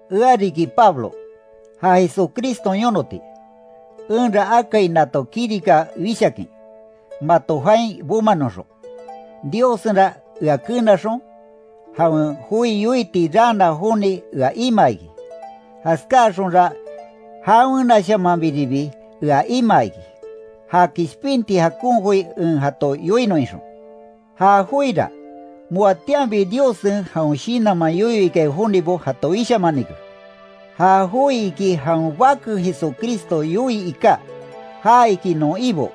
Ea riki Pablo, ja Jesucriston yonoti, enra akai nato kirika wishakin, mato jain bomanoxon. Diossenra ea kenaxon, jawen joi yoiti raana joni ea imaa iki, jaskáaxonra jawenashamanbiribi ea imaa iki, ja kishpinti jakon joi en jato yoinon ixon. Ja joira, moatianbi Diossen jawen shinanman yoyo ikai jonibo jato wishamanike. Ja joi iki jawen bake Jesucristo yoii iká, ja iki non Ibo,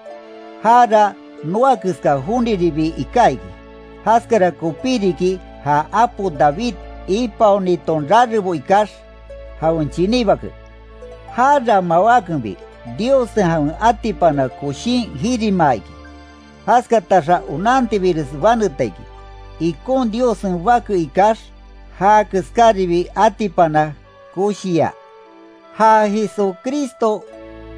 jara noa keska joniribi iká iki, jaskara kopí riki ja apo David ipaoniton rarebo ikax, jawen chiní bake. Jara mawákenbi, Diossen jawen atipana koshín jirimaa iki, jaskataxa onantibires baneta iki, ikon Diossen bake ikax, já keskaribi atipana koshiya. Ja Jesucristo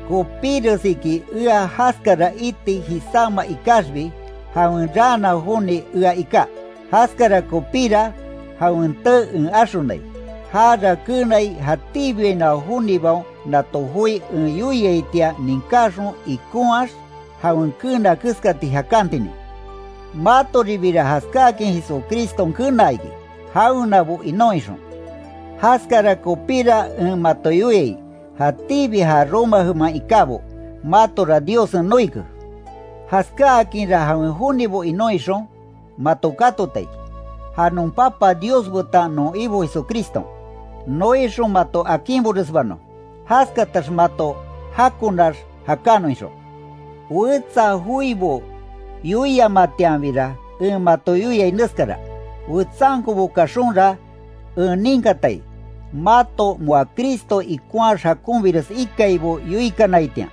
kopíres iki ea jaskara iti jisáma ikaxbi, jawen raana joni ea iká. Jaskara kopíra, jawen tee en axonai. Jara keenai jatíbiainoa jonibaon nato joi en yoiaitian ninkaxon ikonhaax, jawen keena keskati jakantinin. Matoribira jaskáakin Jesucriston kenaa iki, jawenabo inon ixon. Jaskara kopíra en mato yoiai, jatíbi ja Roma jeman ikábo, matora Diossen noike. Jaskáakinra jawen jonibo inon ixon, mato katota iki. Ja non Papa Dios betan non Ibo Jesucriston, noixon mato akinboresbanon, jaskatax mato jakonax jakanon ixon. Wetsa joibo yoiamatianbira, en mato yoiai neskara: Wetsankobo kaxonra, en ninkatai, mato moa Cristo ikonhaax jakonbires ikaibo yoikanaitian,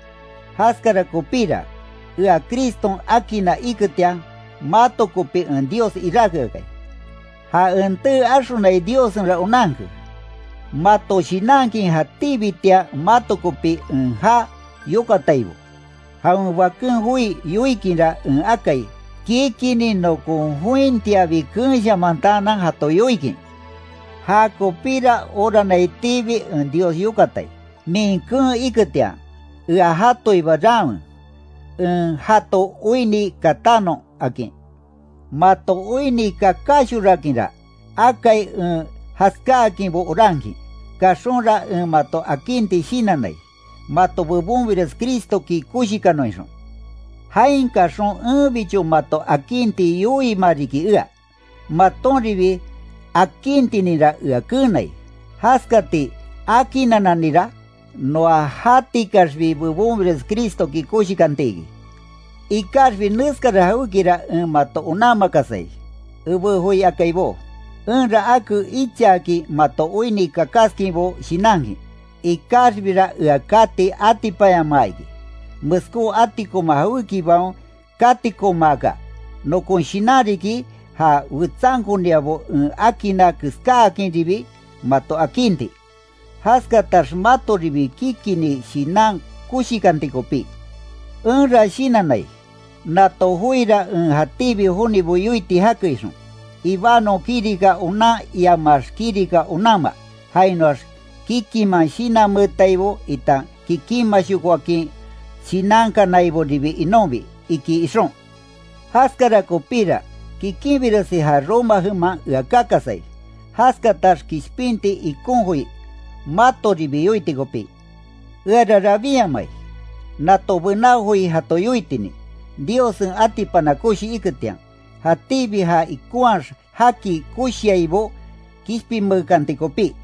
jaskara kopíra, ea Criston akinna iketian, mato kopi en Dios iráke akai. Ja en tee axonai Diossenra onanke, mato shinankin jatíbitian mato kopi en já yokataibo. Jawen Baken joi yoikinra en akai, kikinni nokon jointiabi keenshamantaanan jato yoikin. Jakopíra oranaitiibi en Dios yokatai; min keen iketian, ea jatoiba raanwe, en jato oinni katanon, akin. Mato oinni kakáshorakinra, akai en jaskáakinbo orankin, kaxonra en mato akinti shinannai, mato bebonbires Cristoki koshikanon ixon. Jain kaxon enbicho mato akinti yoiima riki ea, matonribi akintininra ea keenai, jaskati akinannanira, noa jatikaxbi bebonbires Cristoki koshikanti iki. Ikaxbi neskara jawékira en mato onanmakasai, ebé joi akaibó. Enra ake ichaakin mato oinni kakaskinbo shinankin, ikaxbira ea kati atipanyamaa iki, meskó atikoma jawékibaon katikomaaka. Nokon shinan riki, ja wetsankoniabo en akinna keskáakinribi mato akinti, jaskatax matoribi kikinni shinan koshikanti kopí. Enra shinannai, nato joira en jatíbi jonibo yoiti jake ixon, ibanon kirika onan iamax kirika onanma, jainoax kikiman shinanmeetaibo itan kikinmashokoakin shinankanaiboribi inonbi, iki ixon. Jaskara kopíra, kikinbiresi ja Roma jeman ea kakasai, jaskatax kishpinti ikon joi, matoribi yoiti kopí. Eara rabinyamai, nato bená joi jato yoitinin, Diossen atipana koshi iketian, jatíbi ja ikonhaax jaki koshiaibo kishpinmeekanti kopí.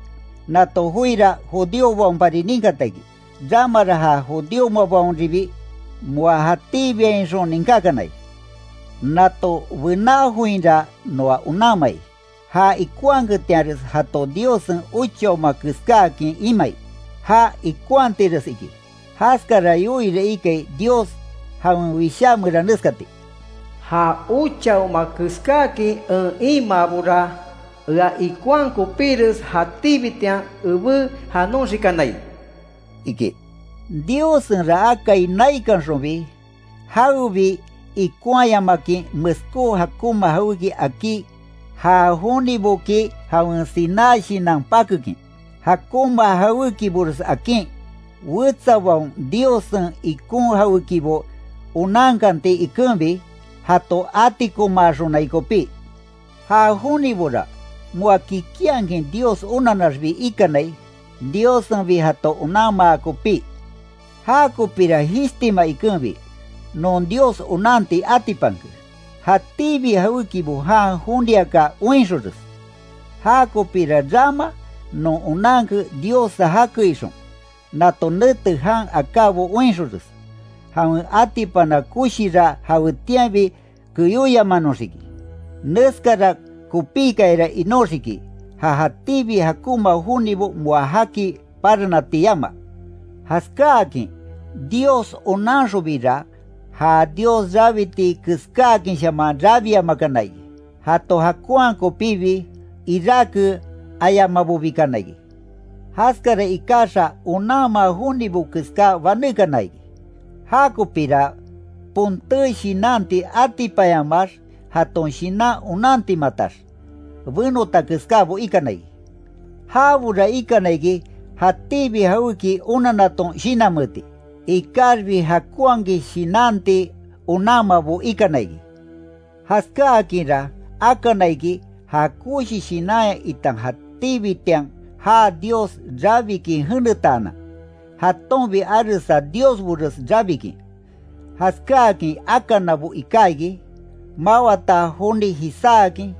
Nato joira judíobaonpari ninkata iki, ramara ja judíomabaonribi moa jatíbiainxon ninkákanai. Nato bená joinra noa onanmai, ja ikonhaketianres jato Diossen ochaoma keskáakin imai. Já ikonhatires iki, jaskara yoiira ikai Dios jawen Wishá meran neskati: “Ja ochaoma keskáakin en imaabora, ea ikonhaa kopíres jatíbitian ebé janoxikanai”, iki. Diossenra akai naikanxonbi, jawebi ikonhayamakin meskó jakonma jawéki akí já joniboki jawen siná shinan pakekin. Jakonma jawékibores akin, wetsabaon Diossen ikon jawékibo onankanti ikenbi, jato atikomaaxonai kopí. Ja jonibora moa kikinhakin Dios onannaxbi ikanai, Diossenbi jato onanmaa kopí. Jakopira jishtima ikenbi, non Dios onanti atipanke, jatíbi jawékibo jan joniaka oinxonres. Jakopira rama non onanke Diossa jake ixon, nato nete jan akábo oinxonres, jawen atipana koshira jawetianbi keyóyamanoxiki. Neskara kopíkayara inóxiki, ja jatíbi jakonma jonibo moa jaki paranati yama. Jaskáakin Dios onanxonbira, ja Dios rabiti keskáakinshaman rabiamakana iki. Jato jakonhaa kopíbi, iráke ayamabobikana iki. Jaskara ikaxa onanma jonibo keská banékana iki. Jakopira, ponté shinanti atipanyamaax, jaton shinan onantimatax, benota keskábo ikana iki. Jabora ikana iki, jatíbi jawéki onannaton shinanmeeti, ikaxbi jakonhakin shinanti onanmabo ikana iki. Jaskáakinra akana iki ja koshi shinanya itan jatíbitian jaa Dios rabikin jenetaanan, jatonbi aresa diosbores rabikin, jaskáakin akanabo iká iki, mawata joni jisáakin,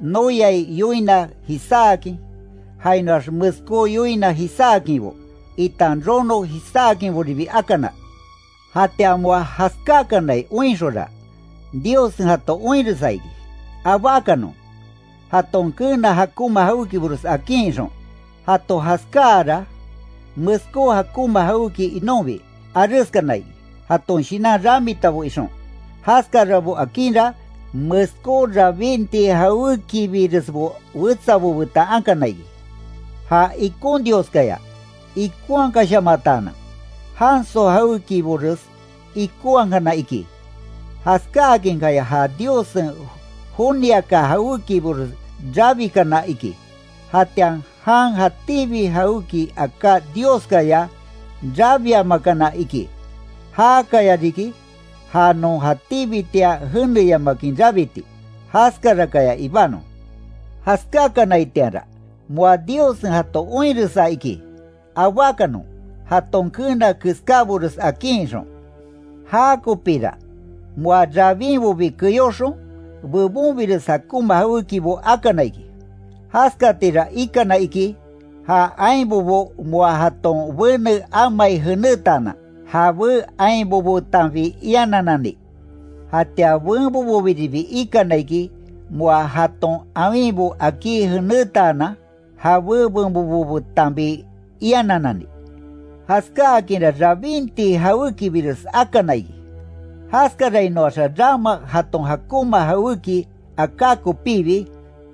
noyai yoina jisáakin, jainoax meskó yoina jisáakinbo, itan rono jisáakinboribi akana. Jatian moa jaskákanai oinxonra, Diossen jato oinresa iki, abákanon, jaton keena jakonma jawékibores akin, ixon. Jato jaskáara, meskó jakonma jawéki inonbi, areskana iki; jaton shinan ramitabo ixon. Jaskarabo akinra, meskó rabinti jawékibiresbo wetsabo betan akana iki. Ja ikon Dioskaya ikonhakashamataanan, janso jawékibores ikonhakana iki, jaskáakinkaya ja Diossen joniaka jawékibores rabikana iki; jatian jan jatíbi jawéki aká Dioskaya rabiamakana iki. Jakaya riki, ja non jatíbitian jeneyamakin rabiti. Jaskarakaya ibanon. Jaskákanaitianra, moa Diossen jato oinresa iki, abákanon, jaton keena keskábores akin ixon. Jakopira, moa rabínbobi keyóxon, bebonbires jakonma jawékibo akana iki. Jaskatira ikana iki, ja ainbobo moa jaton bene amai jenetaanan, jabé ainbobo betanbi ianannani. Jatian benboboribi ikana iki, moa jaton awinbo akí jenetaanan, jabé benbobo betanbi ianannani. Jaskákinra rabinti jawékibires akana iki, jaskarainoaxa rama jaton jakonma jawéki aká kopibi,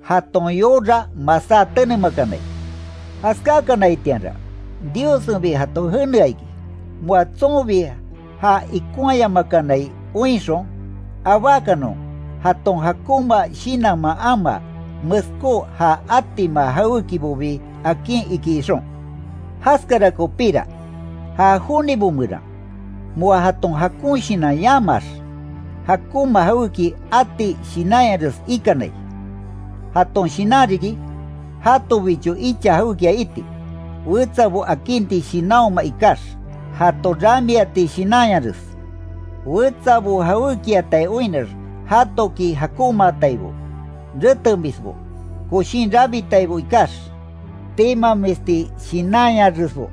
jaton yora masá tenemakanai. Jaskakanaitianra, Diossenbi jato jenea iki, moa tsonbi ja ikonhayamakanai oinxon, abákanon, jaton jakonma shinanman amaa, meskó ja atima jawékibobi akin iki ixon. Jaskara kopíra, ja jonibo meran, moa jaton jakon shinan yamaax, jakonma jawéki ati shinanyares ikanai. Jaton shinan riki, jatobicho icha jawékia iti, wetsabo akinti shinanhoma ikax, jato ramiati shinanyares; wetsabo jawékiatai oinnax, jatoki jakonmaataibo; retemisbo; koshin rabitaibo ikax, timamisti shinanyaresbo;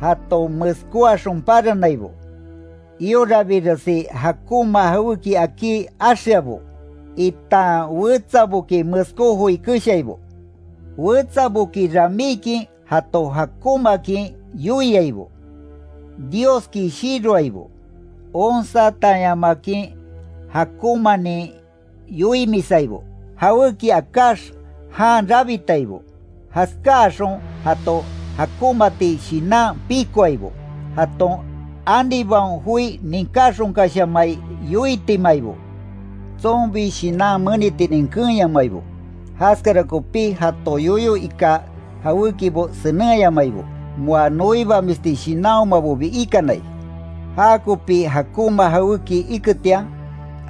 jato meskóaxon paranaibo; iorabiresi jakonma jawéki akí axeabo, itan wetsaboki meskó joi keshaibo. Wetsaboki ramíkin jato jakonmaakin yoiaibo; Dioski shiroaibo; onsatanyamakin jakonmanin yoimisaibo; jawéki akáx jan rabitaibo; jaskáaxon jato jakonmaati shinan pikoaibo; jaton anibaon joi ninkáxonkashamai yoitimataibo. Tsonbi shinan menitinin keenyamabo, jaskara kopí jato yoyo iká jawékibo senenhayamabo; moa noibamisti shinanhomabobi ikanai; jakopi jakonma jawéki iketian,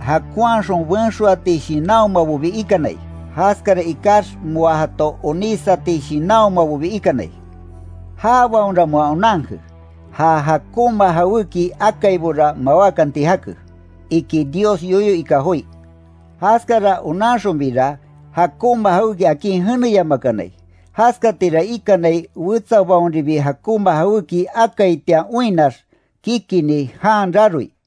jakonhaxon benxoati shinanhomabobi ikanai; jaskara ikax moa jato onísati shinanhomabobi ikanai. Jabaonra moa onanke, ja jakonma jawéki akaibora mawákanti jake, iki Dios yoyo ika joi. Jaskara onanxonbira; jakonma jawéki akin jeneyamakanai. Jaskatira ikanai, wetsabaonribi jakonma jawéki akaitian oinnax, kikinni jan raroi.